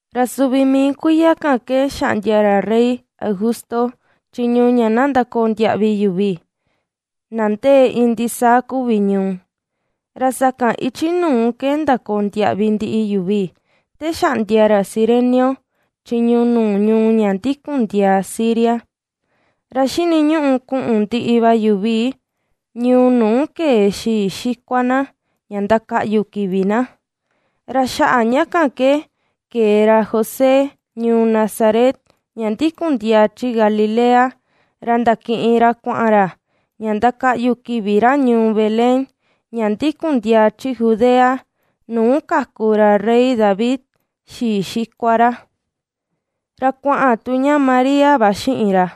Ra suvi mii kuiya kan ke xaꞌndia ra rey Augusto chiñu ña na ndakoo ndiaꞌvi yuvi, na ndee iin ndisaa kuvi ñuu. Ra sakan ichi nuu ke ndakoo ndiaꞌvi ndiꞌi yuvi te xaꞌndia ra Cirenio chiñu nuu ñuu ña ndikun ndiaa Siria. Ra xiniñuꞌu kuꞌun ndiꞌi va yuvi ñuu nuu kee xii xikua na ña ndakaꞌyu kivi na. Ra xaꞌa ña kan ke, ke̱e ra José ñuu Nazaret ña ndikundiaa chi Galilea. Ra ndakiꞌin ra kuaꞌan ra ña ndakaꞌyu kivi ra ñuu Belén ña ndikundiaa chi Judea, nuu kaku ra rey David, xii xikua ra. Ra kuaꞌan tu ña María va xiꞌin ra,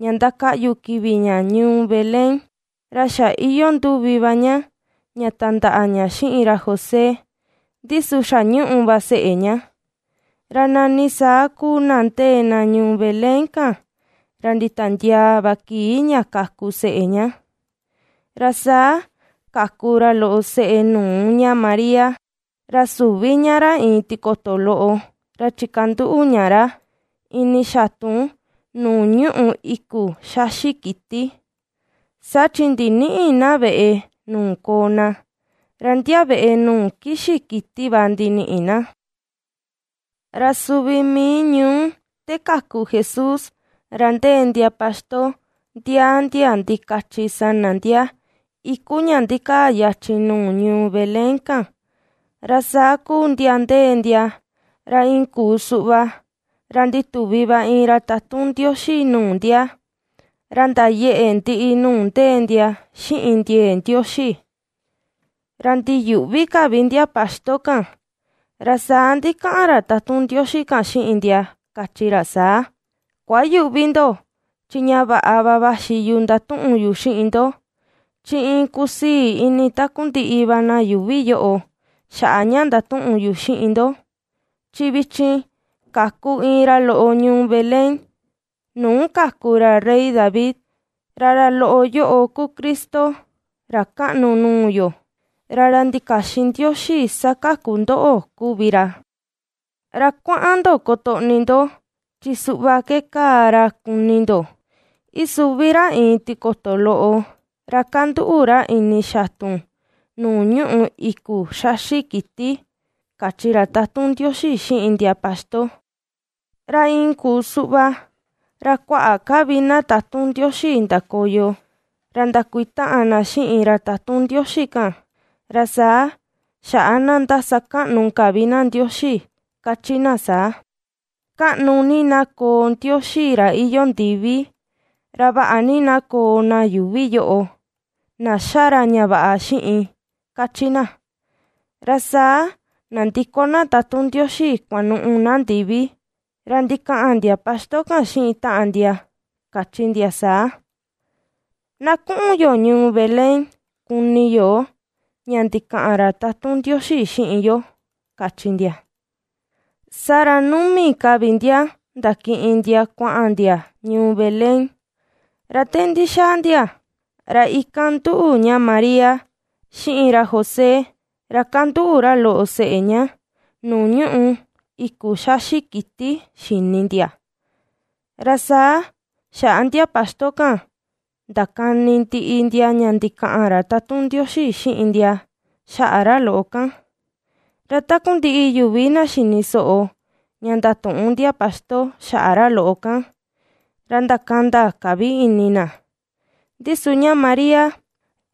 ña ndakaꞌyu kivi ña ñuu Belén, ra xa iyoo nduvi va ña ña tandaꞌa ña xiꞌin ra José, ndi su xa ^ñuꞌu va seꞌe ña. Ra nani saa kuu na ndee na ñuu Belén kan, ra nditiandiaa va kii ña ^kaku seꞌe ña. Ra saa kaku ra loꞌo seꞌe nuu ña María. Ra suvi ña ra iin tikoto loꞌo, ra chikanduꞌu ña ra ini xatun nuu ñuꞌu iku xaxi kiti, saa chi ndinïꞌi na veꞌe nuu koo na, ra ndia veꞌe nuu kixi kiti va ndiniꞌi na. Ra suvi mii ñuu te kaku Jesús, ra ndee ndia paxto ndiaa ndia ndikachi sana ndia iku ña ndikaa yachin nuu ñuu Belén kan. Ra saa kuu ndia ndee ndia, ra iin kuu suꞌva ra ndituvi va iin ra tatun Ndioxi nuu ndia. Ra ndayeꞌe ndiꞌi nuu ndee ndia xiꞌin ndiee Ndioxi, ra ndiyuꞌvi ka vi ndia paxto kan. Ra saa ndikaꞌan ra tatun Ndioxi kan xiꞌin ndia, kachi ra saa: ―Kuayüꞌvi ndo, chi ña vaꞌa va vaxi yu ndatuꞌun yu xiꞌin ndo. Chi iin kusii ini takundiꞌi va na yuuvi yoꞌo xaꞌa ña ndatuꞌun yu xiꞌin ndo. Chi vichin kaku iin ra loꞌo ñuu Belén, nuu kaku ra rey David; ra ra loꞌo yoꞌo ku Cristo, ra kaꞌnu nuu yo, ra ra ndikaxin Ndioxi sakaku ndoꞌo kuvi ra. Ra kuaꞌan ndo kotoꞌni ndo. Chi suꞌva ke kaa ra kuni ndo: Isuvi ra iin tikoto loꞌo, ra kanduꞌu ra ini xatun nuu ñuꞌu iku xaxi kiti ―kachi ra tatun Ndioxi xiꞌin ndia paxto. Ra iin kuu suꞌva, ra kuaꞌa ka vi na tatun Ndioxi ndakoyo ra ndakuitaꞌan na xiꞌin ra tatun Ndioxi kan. Ra saa xaꞌa na ^ndasakaꞌnu ka vi na Ndioxi, kachi na saa: ¡Kaꞌnu ni na koo Ndioxi ra iyoo ndivi! ¡Ra vaꞌa ni na koo na yuuvi yoꞌo, na ^xa ra ña vaꞌa xiꞌin! ―kachi na. Ra saa nandiko na tatun Ndioxi kuanuꞌu na ndivi. Ra ndikaꞌan ndia paxto kan xiꞌin taꞌan ndia, kachi ndia saa: ―Na kuꞌun yo ñuu Belén kuni yo ña ndikaꞌan ra tatun Ndioxi xiꞌin yo ―kachi ndia. Saa ra numi ka vi ndia ndakiꞌin ndia kuaꞌan ndia ñuu Belén. Ra te ndixaa ndia, ra ikan nduꞌu ña María, xiꞌin ra José, ra kanduꞌu ra loꞌo seꞌe ña nuu ñuꞌu iku xaxi kiti xini ndia. Ra saa xaꞌa ndia paxto kan ndakani ndiꞌi ndia ña ndikaꞌan ra tatun Ndioxi xiꞌin ndia xaꞌa ra loꞌo kan. Ra takundiꞌi yuvi na xini soꞌo ña ndatuꞌun ndia paxto xaꞌa ra loꞌo kan, ra ndakanda ka vi ini na. Ndi su ña María,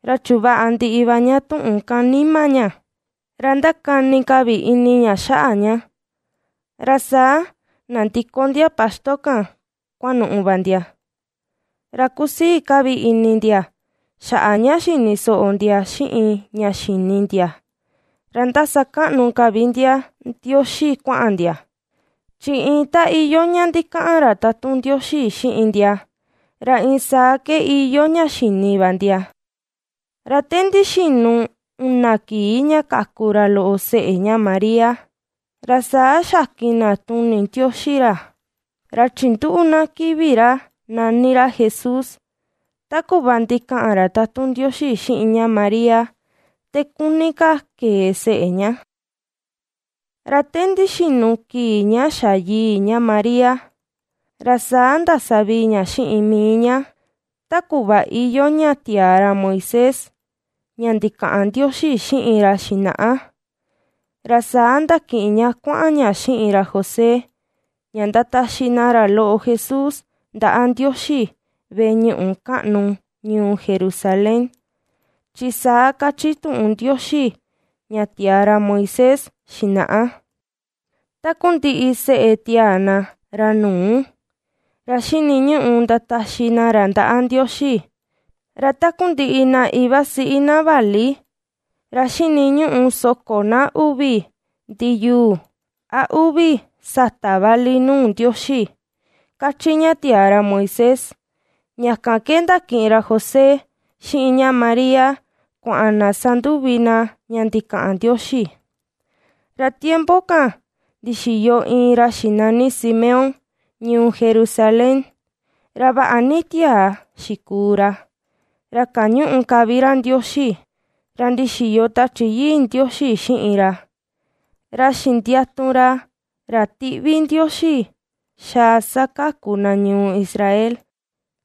ra chuvaꞌa ndiꞌi va ña tuꞌun kan nima ña. Ra ndakani ka vi ini ña xaꞌa ña. Ra saa nandiko ndia paxto kan kuanuꞌu va ndia. Ra kusii ka vi ini ndia xaꞌa ña xini soꞌo ndia xiꞌin ña xini ndia ra ^ndasakaꞌnu ka vi ndia Ndioxi kuaꞌan ndia. Chi iin ta iyoo ña ndikaꞌan ra tatun Ndioxi xiꞌin ndia, ra iin saa ke iyoo ña xini va ndia. Ra te ndixinu una kii ña kaku ra loꞌo seꞌe ña María, ra saa xakin na tuni Ndioxi ra, ra chinduꞌu na kivi ra nani ra Jesús ta kuꞌva ndikaꞌan ra tatun Ndioxi xiꞌin ña María te kuni ka kee seꞌe ña. Ra te ndixinu kii ña xa yii ña María ra saa ndasavii ña xiꞌin mii ña, ta kuꞌva iyoo ña tiaa ra Moisés, ña ndikaꞌan Ndioxi xiꞌin ra xinaꞌa, ra saa ndakiꞌin ña kuaꞌan ña xiꞌin ra José ña ndataxi na ra loꞌo Jesús ndaꞌa Ndioxi veꞌe ñuꞌu kaꞌnu ñuu Jerusalén. Chi saa kachi tuꞌun Ndioxi ña tiaa ra Moisés xinaꞌa: “Takundiꞌi seꞌe tiaa na, ra nuu, ra xiniñuꞌu ndataxi na ra ndaꞌa Ndioxi”. Ra takundiꞌi na ivasiꞌi na vali ra xiniñuꞌu soko na uvi ndiyuu a uvi satà vali nuu Ndioxi, kachi ña tiaa ra Moisés. Ña kan ke ndakiꞌin ra José, xiꞌin ña María kuaꞌan na sanduvi na ña ndikaꞌan Ndioxi. Ra tiempo kan ndixiyo iin ra xinani Simeón ñuu Jerusalén. Ra vaꞌa ni tiaa xikuu ra, ra kañuꞌu ka vi ra Ndioxi. Ra ndixiyo Tachi Yii Ndioxi xiꞌin ra, ra xindiatu ra ra tiꞌvi Ndioxi xaa sakaku na ñuu Israel.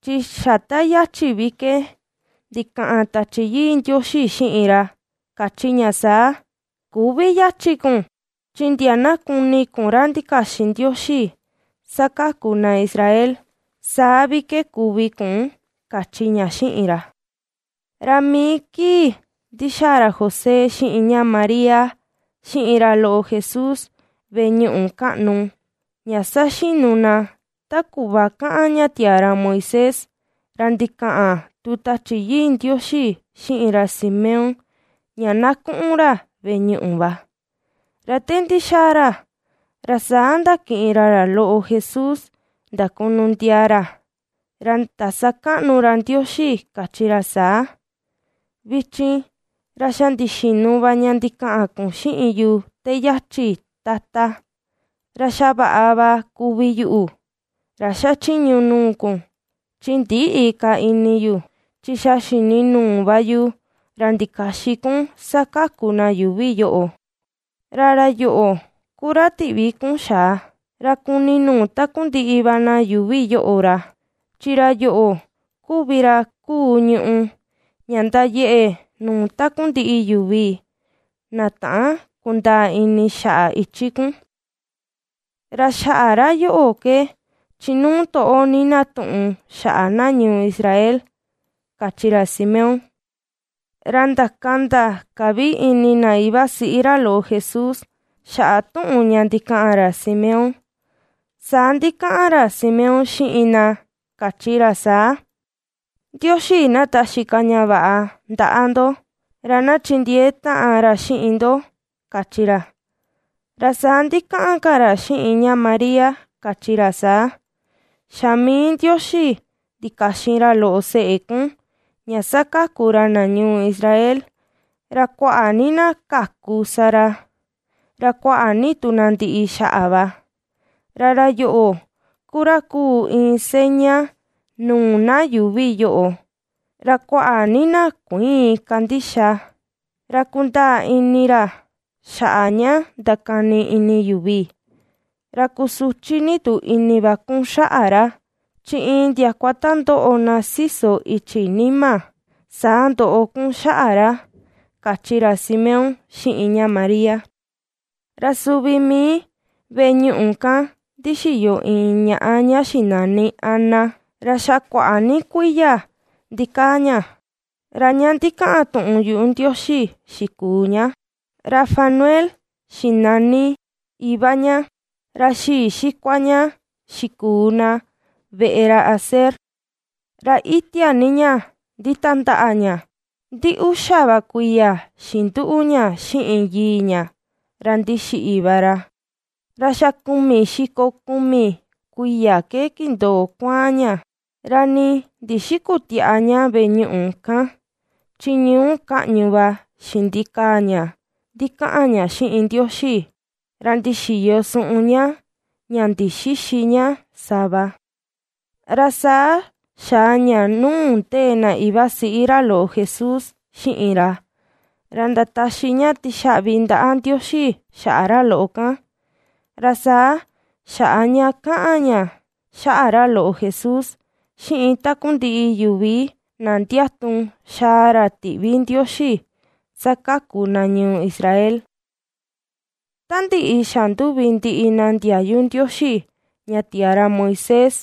Chi xa ta yachi vi ke ndikaꞌan Tachi Yii Ndioxi xiꞌin ra, kachi ña saa: “Küvi yachi kun, chi ndia na kuni kun ra ndikaxin Ndioxi sakaku na Israel, saa vi ke kuvi kun”, kachi ña xiꞌin ra. Ra mii kii ndixaa ra José, xiꞌin ña María, xiꞌin ra loꞌo Jesús veꞌe ñuꞌu kaꞌnu, ña saxinu na ta kuꞌva kaꞌan ña tiaa ra Moisés, ra ndikaꞌan tu Tachi Yii Ndioxi xiꞌin ra Simeón ña na kuꞌun ra veꞌe ñuꞌu va. Ra te ndixaa ra, ra saa ndakiꞌin ra ra loꞌo Jesús ndakunu ndiaa ra, ra ndasakaꞌnu ra Ndioxi, kachi ra saa: Vichin, ra xa ndixinu va ña ndikaꞌan kun xiꞌin yu te yachin, Tata. Ra xa vaꞌa va kuvi yuꞌu, ra xachiñu nuu kun, chi ndïꞌi ka ini yu. Chi xa xini nuu va yu ra ndikaxin kun sakaku na yuvi yoꞌo. Ra ra yoꞌo ku ra tiꞌvi kun xa̱à, ra kuni nuu takundiꞌi va na yuuvi yoꞌo ra. Chi ra yoꞌo kuvi ra kuu ñuꞌu ña ndayeꞌe nuu takundiꞌi yuvi, na täan kundaa ini xaꞌa ichi kun. Ra xaꞌa ra yoꞌo ke chinuu toꞌo ni na tuꞌun xaꞌa na ñuu Israel, kachi ra Simeón. Ra ndakanda ka vi ini na ivasiꞌi ra loꞌo Jesús xaꞌa tuꞌun ña ndikaꞌan ra Simeón. Saa ndikaꞌan ra Simeón xiꞌin na, kachi ra saa: ―Ndioxi na taxi ka ña vaꞌa ndaꞌa ndo; ra na chindiee taꞌan ra xiꞌin ndo ―kachi ra. Ra saa ndikaꞌan ka ra xiꞌin ña María, kachi ra saa: ―Xa mii Ndioxi ndikaxin ra loꞌo seꞌe kun, ña sakaku ra na ñuu Israel. Ra kuaꞌa ni na kaku sa ra, ra kuaꞌa ni tu na ndiꞌi xaꞌa va. Ra ra yoꞌo ku ra kuu iin seña nuu na yuuvi yoꞌo, ra kuaꞌa ni na kuïin kandixa. Ra kundaa ini ra xaꞌa ña ndakani ini yuvi. Ra kusuchi ni tu ini va kun xaꞌa ra. Chi iin ndiakua ta ndoꞌo na siso ichi nima, saa ndoꞌo kun xaꞌa ra ―kachi ra Simeón xiꞌin ña María. Ra suvi mii veꞌe ñuꞌu kan ndixiyo iin ñaꞌa ña xinani Ana, ra xa kuaꞌa ni kuiya ndikaa ña, ra ña ndikaꞌan tuꞌun yuꞌu Ndioxi xikuu ña. Ra Fanuel xinani iva ña. Ra xii xikua ña xikuu na veꞌe ra Aser. Ra itia ni ña nditandaꞌa ña, ndi uxa va kuiya xinduꞌu ña xiꞌin yii ña ra ndixiꞌi va ra. Ra xa kumi xiko kumi kuiya ke kindoo kuaan ña. Ra nii ndixikütiaꞌa ña veꞌe ñuꞌu kan chi ñuu kaꞌñu va xindikaa ña ndikaꞌan ña xiꞌin Ndioxi, ra ndixiyo suꞌun ña ña ndixïxi ña sava. Ra saa xaa ña nuu ndee na ivasiꞌi ra loꞌo Jesús xiꞌin ra. Ra ndataxi ña tixaꞌvi ndaꞌa Ndioxi xaꞌa ra loꞌo kan. Ra saa xaꞌa ña kaꞌan ña xaꞌa ra loꞌo Jesús xiꞌin takundiꞌi yuvi na ndiatu xaa ra tiꞌvi Ndioxi sakaku na ñuu Israel. Ta ndiꞌi xanduvi ndiꞌi na ndiayu Ndioxi ña tiaa ra Moisés,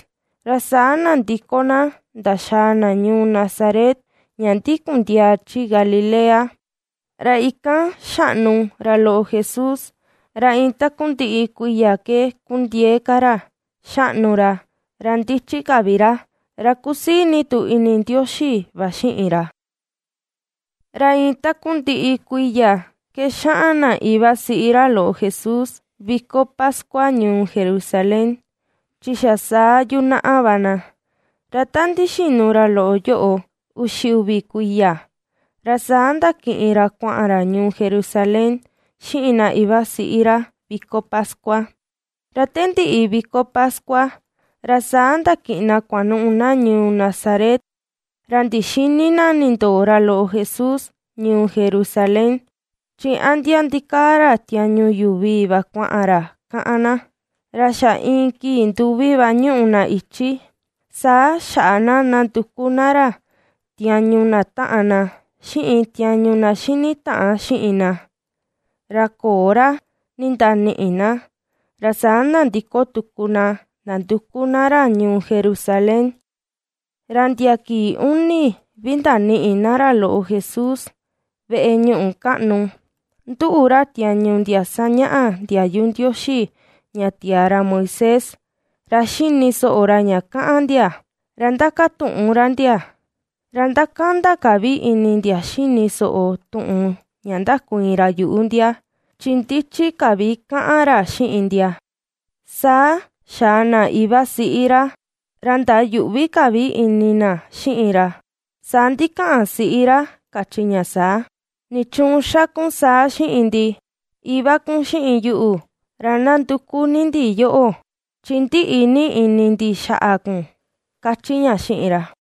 ra saa nandiko na ndaxaa na ñuu Nazaret ña ndikun ndiaa chi Galilea. Ra ikan xaꞌnu ra loꞌo Jesús ra iin takundiꞌi kuiya ke kundiee ka ra, ^xaꞌnu ra, ra ndichi ka vi ra, ra kusii ni tu ini Ndioxi va xiꞌin ra. Ra iin takundiꞌi kuiya ke xaꞌan na ivasiꞌi ra loꞌo Jesús viko pascua ñuu Jerusalén. Chi xa saa yunaꞌa va na. Ra ta ndixinu ra loꞌo yoꞌo uxi uvi kuiya, ra saa ndakiꞌin ra kuaꞌan ra ñuu Jerusalén xiꞌin na ivasiꞌi ra viko pascua. Ra te ndiꞌi viko pascua, ra saa ndakiꞌin na kuanuꞌu na ñuu Nazaret. Ra ndixïni na ndindoo ra loꞌo Jesús ñuu Jerusalén. Chi a ndia ndikaa ra tiañu yuvi va kuaꞌan ra, kaꞌan na. Ra xa iin kii nduvi va ñuꞌu na ichi, saa xaꞌa na nanduku na ra tiañu na taꞌan na, xiꞌin tiañu na xini taꞌan xiꞌin na, ra köo ra ndindaniꞌi na. Ra saa nandiko tuku na nanduku na ra ñuu Jerusalén. Ra ndia kii uni vi ndaniꞌi na ra loꞌo Jesús veꞌe ñuꞌu kaꞌnu. Nduꞌu ra tiañu ndia sañaꞌa ndiayu Ndioxi ña tiaa ra Moisés, ra xini soꞌo ra ña kaꞌan ndia, ra ndakatuꞌun ra ndia. Ra ^ndakanda ka vi ini ndia xini soꞌo tuꞌun ña ndakuiin ra yuꞌu ndia, chi ndichi ka vi kaꞌan ra xiꞌin ndia. Saa xaa na ivasiꞌi ra, ra ndayuꞌvi ka vi ini na xiꞌin ra. Saa ndikaꞌan siꞌi ra, kachi ña saa: ―¿Nichuun xa kun saa xiꞌin ndi? Iva kun xiꞌin yuꞌu, ra ndanduku ni ndi yoꞌo, chi ndiꞌi ni ini ndi xaꞌa kun ―kachi ña xiꞌin ra.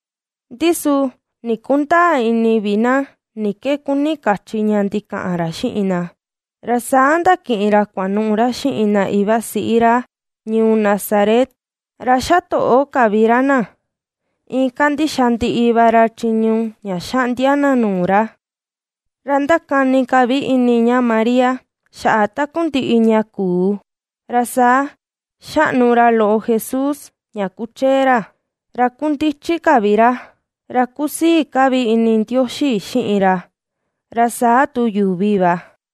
Ndi su nii ndikundäa ini vi na ni ke kuni kachi ña ndikaꞌan ra xiꞌin na. Ra saa ndakiꞌin ra kuanuꞌu ra xiꞌin na ivasiꞌi ra ñuu Nazaret. Ra xatoꞌo ka vi ra na, iin kandixa ndiꞌi va ra chiñu ña xaꞌndia na nuu ra. Ra ndakani ka vi ini ña María xaꞌa takundiꞌi ña kuu. Ra saa ^xaꞌnu ra loꞌo Jesús ña kuchee ra; ra ^kundichi ka vi ra; ra kusii ka vi ini Ndioxi xiꞌin ra, ra saa tu yuvi va.